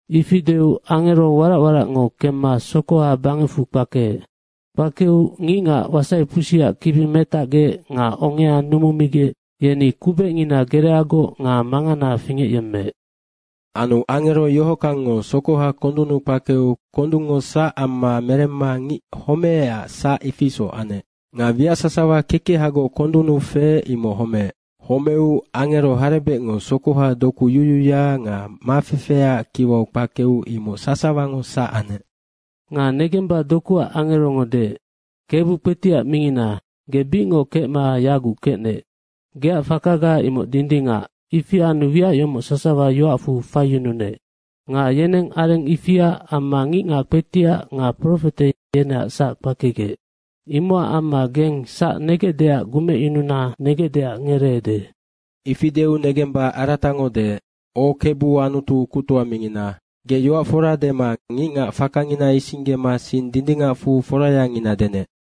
Ifi deu angero warac waracngo kemma sokoha bangecfu kpakeec. Kpakeu ngicngac wasaipusiac kibi metacgec nga ongea numumigec, yeni kubecngina gereagoc nga mangana fingecyemmeec. Anu angero yohockangngo sokoha kondunnu kpakeu kondungngo sac amma meremma ngic homececac sac, ifi isoc anec. Nga wiac sasawa kekehagoc kondunnu feec, imoc homeec. Homeu angero harebecngo sokoha doku yuyuya nga mafefeaac kiwau kpakeu imoc sasawango sac anec. Nga negemba dokuac angerongo deec, “Kebu kpetiac mingnina, ge bicngoc kecma yaguc kecnec. Geac fakaga imoc dindingac, ifi anu wiac yomoc sasawa yoacfu faiyununec. Nga yeneng areng ifia amma ngicngac kpetiac nga profete yeneac sac kpakegec. Imocac amma geng sac negecdeac gumecyununa negecdeac ngereede.” Ifi deu negemba aratango deec, “O Kebu Anutu kuctoa mingina, ge yoac fora dema ngicngac fakangina isinggema sing dindingacfu forayangina denec.”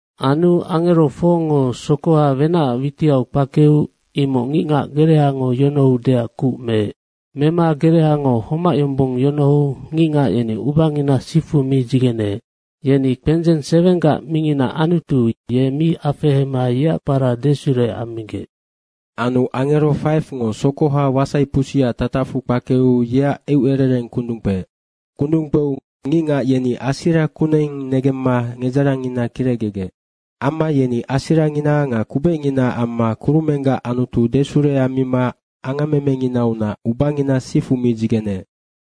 Anu angero 4ngo sokoha wenacac witiau kpakeu imoc ngicngac gerehango yonohoudeac kuc meec. Mema gereango homac yombong yonohou ngicngac yeni ubangina sifu mi dzigeneec. Yeni kpendzeng 7gac mingina Anutu, ye mi afehema yeac kpara desure ammigec. Anu angero 5ngo sokoha wasaipusiac tatacfu kpakeu yeac eucerereng kundung kpeec. Kundung kpeu ngicngac yeni asira kuneng negemma nedzarangngina kirecgegec. Amma yeni asirangina nga kubecnginaac amma kurumenggac Anutu desure ammima angammemenginaunac ubangina sifu mi dzigeneec.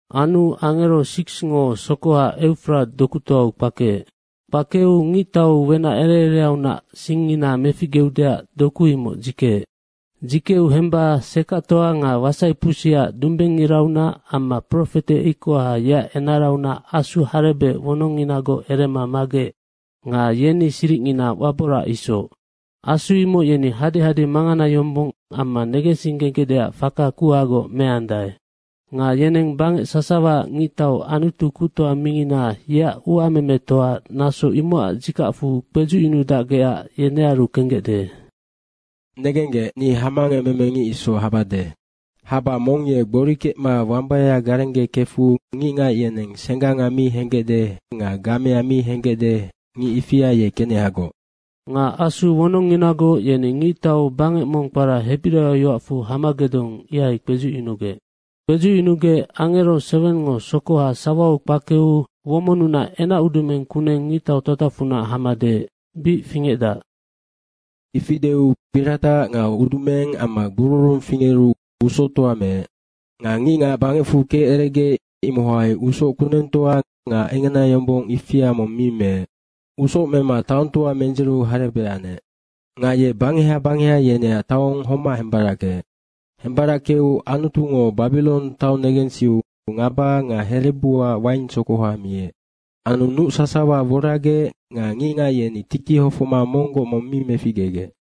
Anu angero 6ngo sokoha Eufrata dokutoau kpakeec. Kpakeu ngictau wenac ere ereaunac singngina meficgeudeac doku imoc dzikeec. Dzikeu hemba sekactoa nga wasaipusiac dumbengngiraunac amma profete ikoha, yeac enaraunac asu harebec wononginagoc erema magec nga yeni siricngina waborac isoc. Asu imoc yeni hadehade mangana yombong amma negensinggegecdeac faka kuhagoc meandae. Nga yeneng bangec sasawaac ngictau Anutu kuctoa mingina, yeac uamemetoa, naso imocac dzikacfu kpedzucyunudacgecac yenearu kenggecde. “Negenggec, ni hamangecmeme ngic isoc habade. Haba mong ye gbori kecma wambaya garengge kefu ngicngac yeneng sengganga mi henggecde nga gamea mi henggecde, ngic ifia ye kenehagoc.” Nga asu wononginagoc yeni ngictau bangec mong kpara hebiraio yoacfu Hamagedong, ihai kpedzucyunugec. Kpedzucyunugec angero 7ngo sokoha sawau kpakeu womonnunac enacudumeng kuneng ngictau tatacfunac hama deec, “Bic fingecdac.” Ifi deu piratac nga udumeng amma gbururung fingeru, usoctoa meec. Nga ngicngac bangecfu keceregec, imohai usoc kunengtoa nga engenayombong ifia mong mi meec. Usoc mema taongtoa mendziru harebec anec. Nga ye bangeha bangeha yeneac taong homac hembarackeec. Hembarackeu Anutungo Babirong taong negensiu ngaba nga herebuac waingsokoha miec. Anu nuc sasawa woragec nga ngicngac yeni tiki hofocma monggoc mong mi meficgegec.